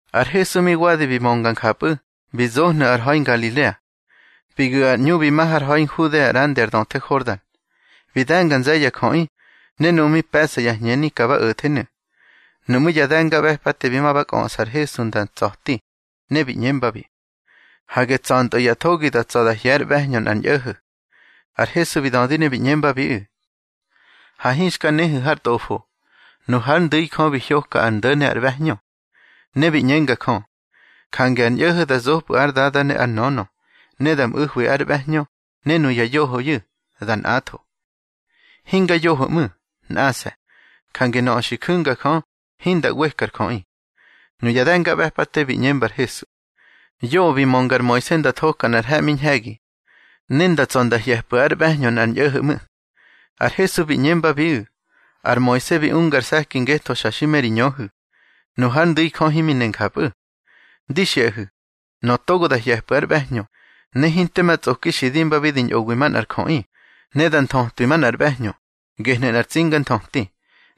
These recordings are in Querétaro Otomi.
Ar Hesu mi wadi bi mönga njapꞌu̱, bi zohnu̱ ar ha̱i Ngalilea. Bi gu̱ ar ꞌñu bi ma har ha̱i Nhudea ꞌrandi ar döthe Hordan. Bi de̱nga nze̱ye̱ ya jöꞌi, ne nuꞌu̱ mi pe̱ꞌsa ya hñeni ka ba o̱thenu̱. Nuꞌmú̱ ya de̱ngaꞌbe̱pate bi ma ba kꞌöꞌsa ar Hesu nda tsa̱ti, ne bi ꞌñembabi: —Hage tsa̱ntꞌö ya thogi da tsa̱ da hye̱ ár ꞌbe̱hñö nꞌar ñꞌo̱ho̱. Ar Hesu bi dödi ne bi ꞌñembabiꞌu̱: —Ha hinxka nehu̱ har Tꞌofo, nu hár ndu̱i, Jö bi hyoka ar ndo̱ ne ar ꞌbe̱hñö. Ne bi ꞌñenga Jö: Jange ar ñꞌo̱ho̱ da zopꞌu̱ ár dada ne ár nönö, ne da mꞌu̱hwi ár ꞌbe̱hñö, ne nuya yohoyu̱, da nꞌatho. Hinga yoho ꞌmu̱, nꞌase̱. Jange nöꞌö xi ju̱nga Jö, hinda ꞌweka ar jöꞌi. Nuya de̱ngaꞌbe̱pate bi ꞌñemba ar Hesu: —Yoꞌö bi mönga ar Moise nda thoka nꞌar he̱ꞌmi ñhe̱gi, ne nda tsa̱ nda hye̱pꞌu̱ ár ꞌbe̱hñö nꞌar ñꞌo̱ho̱ ꞌmu̱. Ar Hesu bi ꞌñembabiꞌu̱: —Ar Moise bi unga ar se̱ki ngetho xa xi me ri ñöhu̱. Nu hár ndu̱i Jö himi ne njapꞌu̱. Di xiꞌahu̱, nöꞌö togo da hye̱pꞌu̱ ár ꞌbe̱hñö, ne hinte ma tsꞌoki xi dimbabi di ñꞌowi manꞌar jöꞌi, ne da nthötwi manꞌar ꞌbe̱hñö, gehnu̱ nꞌar tsinganthöti.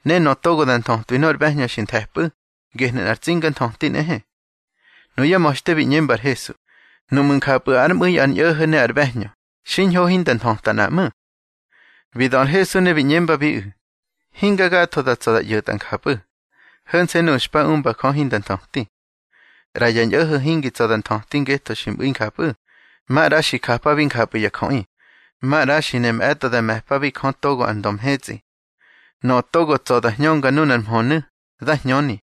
Ne nöꞌö togo da nthötwi nor ꞌbe̱hñö xi nthe̱pꞌu̱, gehnu̱ nꞌar tsinganthöti nꞌehe. Nuyá ma̱xte bi ꞌñemba ar Hesu: —Nuꞌmu̱ njapꞌu̱ ár mꞌu̱i ar ñꞌo̱ho̱ ne ár ꞌbe̱hñö, xiñho hinda nthöta nꞌa ꞌmu̱. Bi dö ar Hesu ne bi ꞌñembabiꞌu̱: —Hinga gatho da tsa̱ da ꞌyo̱tꞌa njapꞌu̱, ho̱nse̱ nuꞌu̱ xpa umba Jö hinda nthöti. ꞌRa ya ñꞌo̱ho̱ hingi tsa̱ da nthöti ngetho xi mꞌu̱i njapꞌu̱, maꞌra xi japabi njapꞌu̱ ya jöꞌi, maꞌra xi ne mꞌe̱tꞌo da me̱pabi Jö togo ar ndö mhetsꞌi. Nöꞌö togo tsa̱ da hñönga nunar mhönu̱, dá hñöni.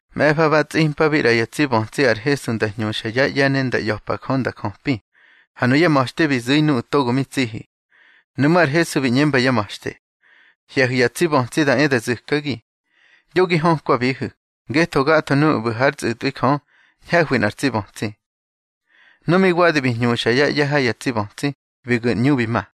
Mꞌe̱fa ba tsꞌimpabi ꞌra ya tsi bötsi ar Hesu nda hñuxa yá ꞌye̱ ne nda ꞌya̱pa Jö nda jöpi. Ha nuyá ma̱xte bi zu̱i nuꞌu̱ togo mi tsihi. Nuꞌmú̱ ar Hesu bi ꞌñemba yá ma̱xte: —Hye̱hu̱ ya tsi bötsi da e da zu̱kagi, yo gi hökwabihu̱, ngetho gatho nuꞌu̱ ꞌbu̱ hár tsꞌu̱tꞌwi Jö, ñhe̱hwi nꞌar tsi bötsi. Nu mi wadi bi hñuxa yá ꞌye̱ ha ya tsi bötsi, bi gu̱ ar ꞌñu bi ma.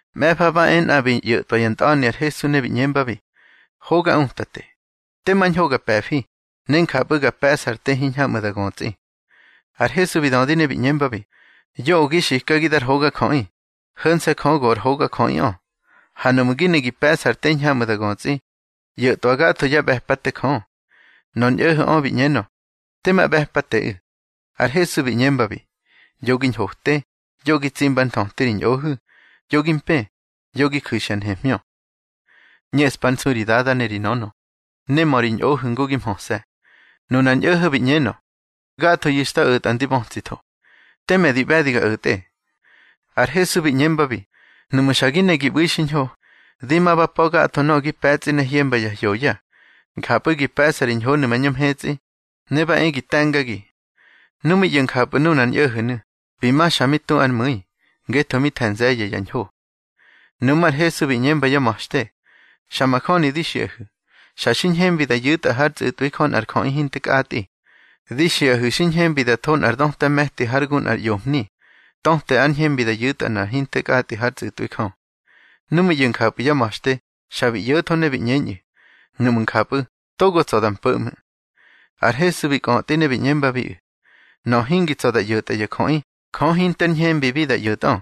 Mꞌe̱fa ba e nꞌa bi ꞌyo̱tꞌwa nꞌar ntꞌa̱ni ar Hesu, ne bi ꞌñembabi: —Hoga Utate, tema ñho ga pe̱fi, ne njapꞌu̱ ga pe̱ꞌsa ar te hiñhamꞌu̱ da götsꞌi. Ar Hesu bi dödi ne bi ꞌñembabi: —Yoꞌö gi xikagi dar hogajöꞌi. Ho̱nse̱ Jö go ar hogajöꞌiꞌö. Ha nuꞌmu̱ gi ne gi pe̱ꞌsa ar te hiñhamꞌu̱ da götsꞌi, ꞌyo̱twa gatho yá ꞌbe̱pate Jö. Nor ñꞌo̱ho̱ꞌö bi ꞌñenö: —Tema ꞌbe̱pateꞌu̱. Ar Hesu bi ꞌñembabi: —Yo gi ñhote, yo gi tsimba ár nthöti ri ñꞌohu̱, yo gi mpë, yo gi ju̱xya nhemhñö. ꞌÑeꞌspa ár nsu ri dada ne ri nönö, ne mö ri ñꞌohu̱ ngu gi mhöse̱. Nunar ñꞌo̱ho̱ bi ꞌñenö: —Gathoyu̱ xta o̱tꞌa ndi bötsitho. Teme di ꞌbe̱di ga o̱tꞌe. Ar Hesu bi ꞌñembabi: —Nuꞌmu̱ xa gi ne gi ꞌbu̱i xiñho, di ma ba pa̱ gatho nöꞌö gi pe̱tsꞌi ne hyemba ya hyoya. Njapꞌu̱ gi pe̱ꞌsa ri ñhonu̱ mañö mhetsꞌi, ne ba e gi te̱ngagi. Nu mi ꞌyo̱ njapꞌu̱ nunar ñꞌo̱ho̱nu̱, bi ma xa mi tu ár mu̱i, ngetho mi the̱ nze̱ye̱ ya ñho. Nuꞌmú̱ ar Hesu bi ꞌñemba yá ma̱xte: —Xa majöni di xiꞌahu̱, xa xi ñhembi da yu̱tꞌa hár tsꞌu̱tꞌwi Jö nꞌar jöꞌi hinte kꞌatꞌi. Di xiꞌahu̱ xi ñhembi da tho nꞌar döta me̱ti hár gu nꞌar ꞌyomhni. Töte ár ñhembi da yu̱tꞌa nꞌa hinte kꞌatꞌi hár tsꞌu̱tꞌwi Jö. Nu mi ꞌyo̱ njapꞌu̱ yá ma̱xte, xa bi ꞌyo̱tho ne bi ꞌñeñꞌu̱: —Nuꞌmu̱ njapꞌu̱, togo tsa̱ da mpo̱ ꞌmu̱. Ar Hesu bi kꞌötꞌi ne bi ꞌñembabiꞌu̱: —Nöꞌö hingi tsa̱ da ꞌyo̱tꞌa ya jöꞌi, Jö hinter ñhembibi da ꞌyo̱tꞌö.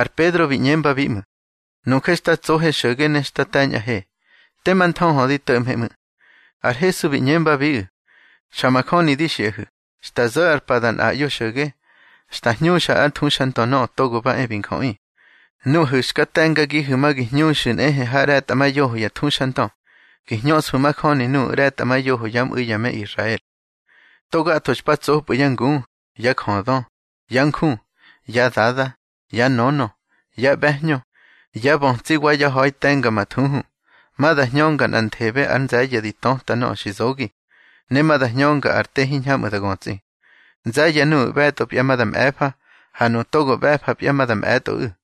Ar Pedro bi ꞌñembabi ꞌmu̱: —Nuje xta tsohe xo̱ge ne xta te̱ñꞌahe. Tema nthöhö di to̱ꞌmhe ꞌmu̱. Ar Hesu bi ꞌñembabiꞌu̱: —Xa majöni di xiꞌahu̱, xta zo̱ ar pa da nꞌaꞌyo xo̱ge, xta hñuxa hár thuxandö Nöꞌö Togo ba e bi Njöꞌi, nuꞌahu̱ xka te̱ngagihu̱ ma gi hñuxu̱ nꞌehe ha ꞌre̱tꞌamayoho ya thuxandö, gi hñöꞌsfu̱ majöni nuꞌu̱ ꞌre̱tꞌamayoho yá mꞌu̱i ya me Israel. To gatho xpa tsopꞌu̱ yá ngu, yá jödö, yá nju, yá dada, yá nönö, yá ꞌbe̱hñö, yá bötsi wa yá ha̱i te̱mga ma thuhu, ma da hñönga nꞌanthebe ár nze̱ye̱ di töta nöꞌö xi zogi, ne ma da hñönga ar te hiñhamꞌu̱ da götsꞌi. Nze̱ye̱ nuꞌu̱ ꞌbe̱tꞌopya ma da mꞌe̱fa, ha nuꞌu̱ togo ꞌbe̱fapya ma da mꞌe̱tꞌoꞌu̱.